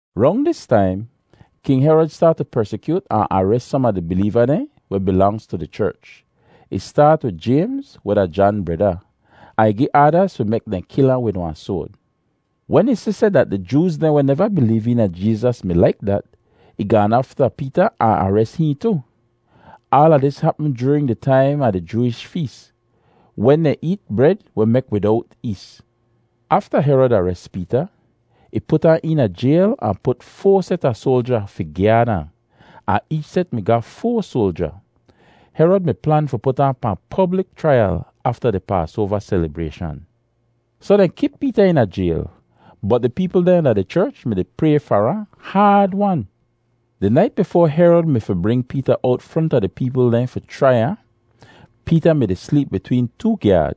Rong dis taim King Herod staat tu persikyoot ahn ares som a di bileeva dehn weh bilangz tu di cherch. Ih staat wid Jaymz weh da Jan breda, ahn ih gi aadaz fi mek dehn kil ahn wid wahn soad. Wen ih si seh dat di Jooz dehn weh neva bileev eena Jeezas mi laik dat, ih gaan afta Peeta ahn ares hihn tu. Aala dis hapm joorin di taim a di Jooish fees wen dehn eet bred weh mek widowt ees. Afta Herod ares Peeta, ih put ahn eena jayl ahn put foa set a soalja fi gyaad ahn, ahn eech set mi ga foa soalja. Herod mi plan fi put ahn pahn poblik chraiyal afta di Paasoava selibrayshan. Soh dehn kip Peeta eena jayl, bot di peepl dehn da di cherch mi-di pray far ahn haad-wan. Di nait bifoa Herod mi fi bring Peeta owt fronta di peepl dehn fi chrai ahn, Peeta mi-di sleep bitween too gyaad.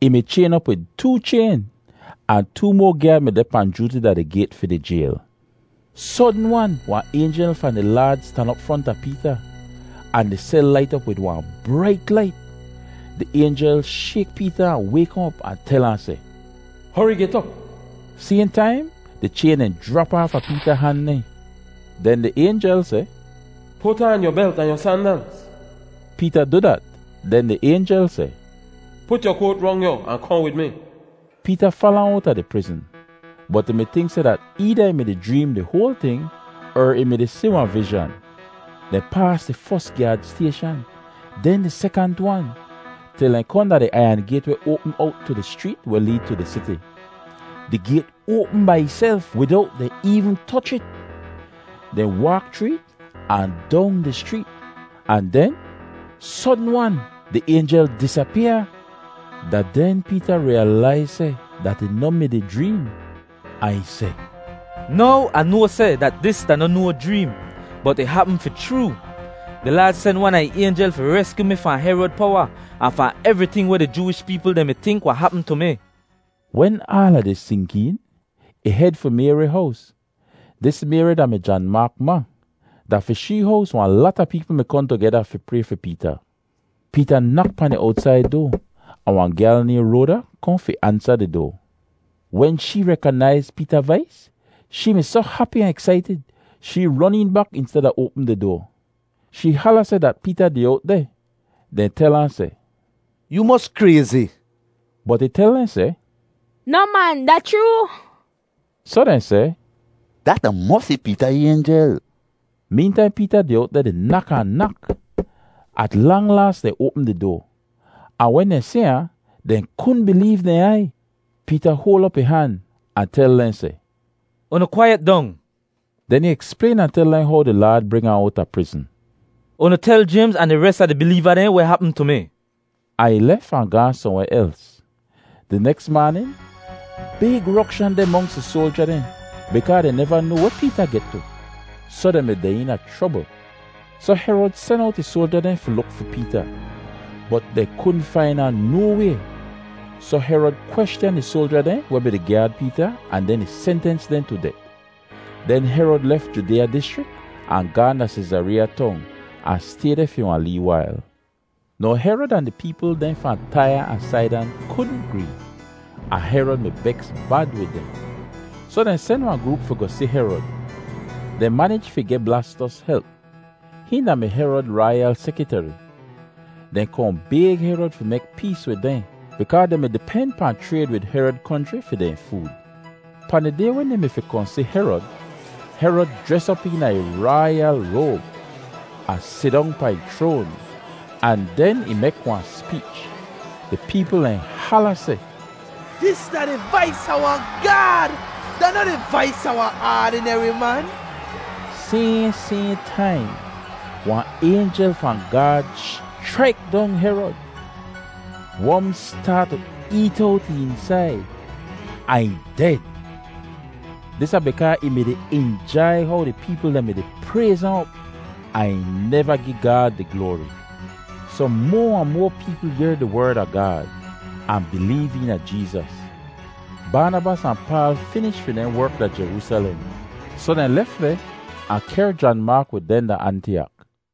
Ih mi chayn op wid too chayn, ahn too moa gyaad mi deh pahn jooti da di gayt fi di jayl. Sodn-wan wahn aynjel fahn di Laad stan op fronta Peeta, ahn di sel lait op wid wahn brait lait. Di aynjel shayk Peeta ahn wayk ahn op ahn tel ahn seh, “Hori get op!” Sayhn taim di chayn dehn jrap aafa Peeta han dehn. Den di aynjel seh, “Put aan yu belt ahn yu sandalz.” Peeta du dat, den di aynjel seh, “Put yu koat rong yu ahn kohn wid mi.” Peeta fala ahn owta di prizn, bot ih mi tink seh dat eeda ih mi-di jreem di hoal ting, er ih mi-di si wahn vizhan. Dehn paas di fos gyaad stayshan, den di sekant wan, til dehn kohn da di aiyan gayt weh oapm owt tu di schreet weh leed tu di siti. Di gayt oapm bai ihself widowt dehn eevn toch it. Dehn waak chroo it ahn dong di schreet, ahn den sodn-wan di aynjel disapyaa. Da den Peeta riyalaiz seh dat ih noh mi-di jreem, ahn ih seh, “Now Ah noa seh dat dis da noh no jreem, bot ih hapm fi chroo. Di Laad sen wan a ih aynjel fi reskyu mi fahn Herod powa ahn fahn evriting weh di Jooish peepl dehn mi tink wahn hapm tu mi.” Wen aala dis sink een, ih hed fi Mayri hows. Dis Mayri da-mi Jan Maak ma. Da fi shee hows wahn lata peepl mi kohn tugeda fi pray fi Peeta. Peeta nak pahn di owtsaid doa ahn wahn gyal nayhn Roada kohn fi ansa di doa. Wen shee rekonaiz Peeta vais, shee mi soh hapi ahn eksaitid shee ron een bak insteda oapm di doa. Shee hala seh dat Peeta deh owt deh. Dehn tel ahn seh, “Yoo mos krayzi!” Bot ih tel dehn seh, “Noh man, da chroo!” Soh dehn seh, “Dat da mosi Peeta aynjel.” Meentaim Peeta deh owt deh di nak ahn nak. At lang laas dehn oapm di doa, ahn wen dehn si ahn, dehn kudn bileev dehn aiy. Peeta hoal op ih han ahn tel dehn seh, “Unu kwaiyet dong!” Den ih eksplayn ahn tel dehn how di Laad bring ahn owta prizn. “Unu tel Jaymz ahn di res a di bileeva dehn weh hapm tu mi.” Ahn ih lef ahn gaahn sohnweh els. Di neks maanin big rokshan deh monks di soalja dehn bikaa dehn neva noa weh Peeta get tu, soh dehn mi deh eena chrobl. Soh Herod sen owt ih soalja dehn fi luk fi Peeta, bot dehn kudn fain ahn no way. Soh Herod kweschan di soalja dehn weh mi-di gyaad Peeta ahn den ih sentens dehn tu det. Den Herod lef Judeeya dischrik ahn gaahn da Seezareeya Tong ahn stay deh fi wahn lee wail. Now Herod ahn di peepl dehn fahn Taiya ahn Saidan kudn gree, ahn Herod mi beks bad wid dehn. Soh dehn sen wahn groop fi goh si Herod. Dehn manij fi geh Blastos help. Hihn da-mi Herod raiyal sekiteri. Dehn kohn bayg Herod fi mek pees wid dehn bikaa dehn mi-di pen pahn chrayd wid Herod konchri fi dehn food. Pahn di day wen dehn mi fi kohn si Herod, Herod jres op eena ih raiyal roab ahn sidong pahn ih chroan ahn den ih mek wahn speech. Di peepl dehn hala seh, “Dis da di vais a wahn gaad; da noh di vais a wahn aadineri man.” Sayhn sayhn taim, wahn aynjel fahn Gaad schraik dong Herod. Wom staat tu eet owt ih eensaid ahn ih ded. Dis da bikaa ih mi-di injai how di peepl dehn mi-di prayz ahn op, ahn ih neva gi Gaad di gloari. Soh moa ahn moa peepl yehr di Werd a Gaad, ahn bileev eena Jeezas. Baanabas ahn Paal finish fi dehn werk da Jeroosalem, soh dehn lef deh ahn kehr Jan Maak wid dehn da Antiyak.